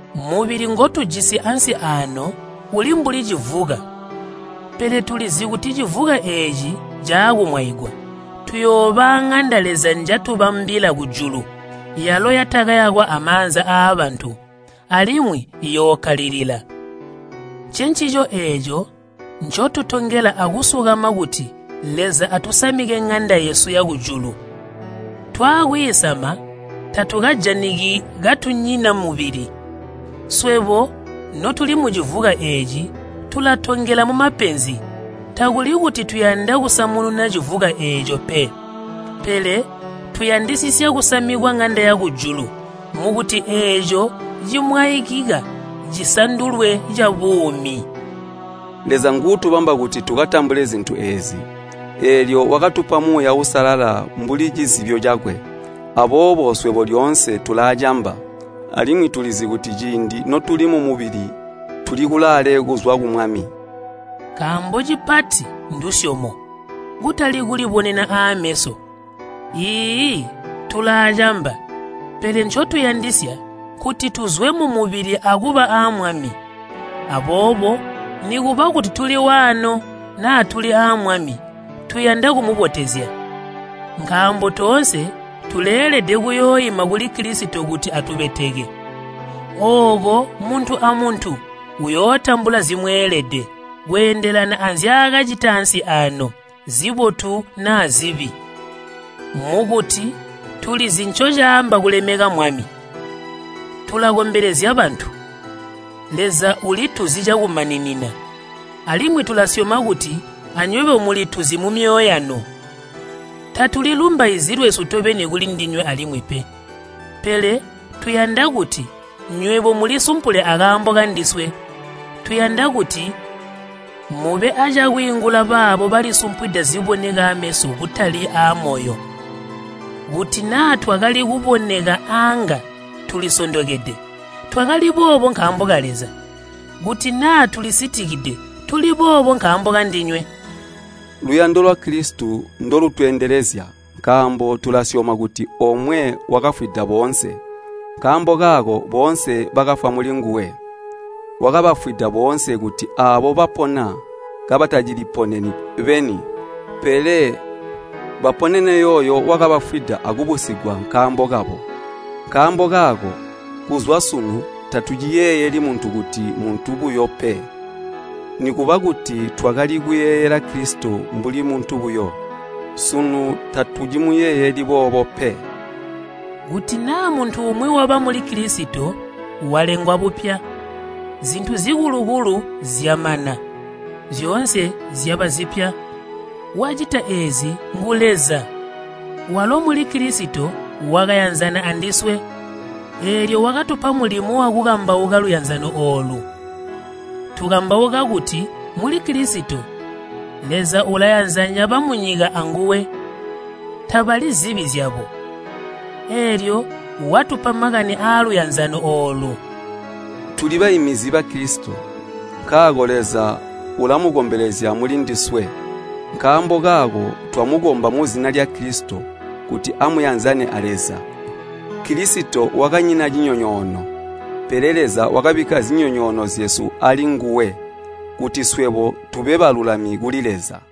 Mubili ngotujisi ansi aano uli mbuli civuka. Pele tulizi kuti civuka eeci caakumwaigwa, tuyooba aaŋanda Leza njatubambila kujulu, yalo yatakayakwa amaanza aabantu, alimwi iyookkalilila. Ncencico eeco ncotutongela akusukama kuti Leza atusamike ŋanda yesu yakujulu. Twaakwiisama, tatukajaniki katunyina mubili. Swebo notuli mucivuka eeci tulatongela mumapenzi. Takuli kuti tuyanda kusamununa civuka eeco pe, pele tuyandisisya kusamikwa ŋanda yakujulu mukuti eeco cimwaikika cisandulwe cabuumi. Leza nguutubamba kuti tukatambule zintu eezi, eelyo wakatupa Muuya Uusalala mbuli cizibyo cakwe. Aboobo swebo lyoonse tulaacamba, alimwi tulizi kuti ciindi notuli mumubili tuli kulaale kuzwa ku Mwami. Nkaambo cipati ndusyomo kutali kulibonena aameso. Iiyi, tulaacamba, pele ncotuyandisya nkuti tuzwe mumubili akuba aa Mwami. Aboobo nikuba kuti tuli waano naa tuli aa Mwami, tuyanda kumubotezya. Nkaambo toonse tuleelede kuyooima kuli Kilisito kuti atubeteke. Ooko muntu amuntu uyootambula zimweelede, kweendelana anzyaakacita ansi aano, zibotu naa zibi. Mukuti tulizi ncocaamba kulemeka Mwami, tulakombelezya bantu. Leza ulituzi cakumaninina, alimwi tulasyoma kuti anywebo mulituzi mumyoyo yanu. Tatulilumbaizyi lwesu tobeni kulindinywe alimwi pe, pele tuyanda kuti nywebo mulisumpule akaambo kandiswe. Tuyanda kuti mube acakwiingula baabo balisumpwida ziboneka ameso kutali aamoyo. Kuti naa twakali kuboneka aanga tulisondokede, twakali boobo nkaambo ka Leza. Kuti naa tulisitikide, tuli boobo nkaambo kandinywe. Luyando lwa Kilisito ndolutweendelezya, nkaambo tulasyoma kuti omwe wakafwida boonse, nkaambo kaako boonse bakafwa mulinguwe. Wakabafwida boonse kuti aabo bapona kabataciliponeni beni, pele baponene yooyo wakabafwida akubusigwa nkaambo kabo. Nkaambo kaako, kuzwa sunu tatuciyeeyeli muntu kuti muntu buyo pe. Nikuba kuti twakali kuyeeyela Kilisito mbuli muntu buyo, sunu tatucimuyeeyeli boobo pe. Kuti naa muntu umwi waba muli Kilisito, walengwa bupya. Zintu zikulu-kulu zyamana, zyoonse zyaba zipya. Wacita eezi ngu Leza, walo muli Kilisito wakayanzana andiswe. Eelyo wakatupa mulimo wakukambauka luyanzano oolu. Tukambauka kuti muli Kilisito, Leza ulayanzanya bamunyika anguwe, tabali zibi zyabo. Eelyo watupa makani aaluyanzano oolu. Tuli baiminizi ba Kilisito, nkaako Leza ulamukombelezya mulindiswe. Nkaambo kaako twamukomba muzina lya Kilisito kuti amuyanzane a Leza. Kilisito wakanyina cinyonyoono, pele Leza wakabikka zinyonyoono zyesu alinguwe, kuti swebo tube balulami kuli Leza.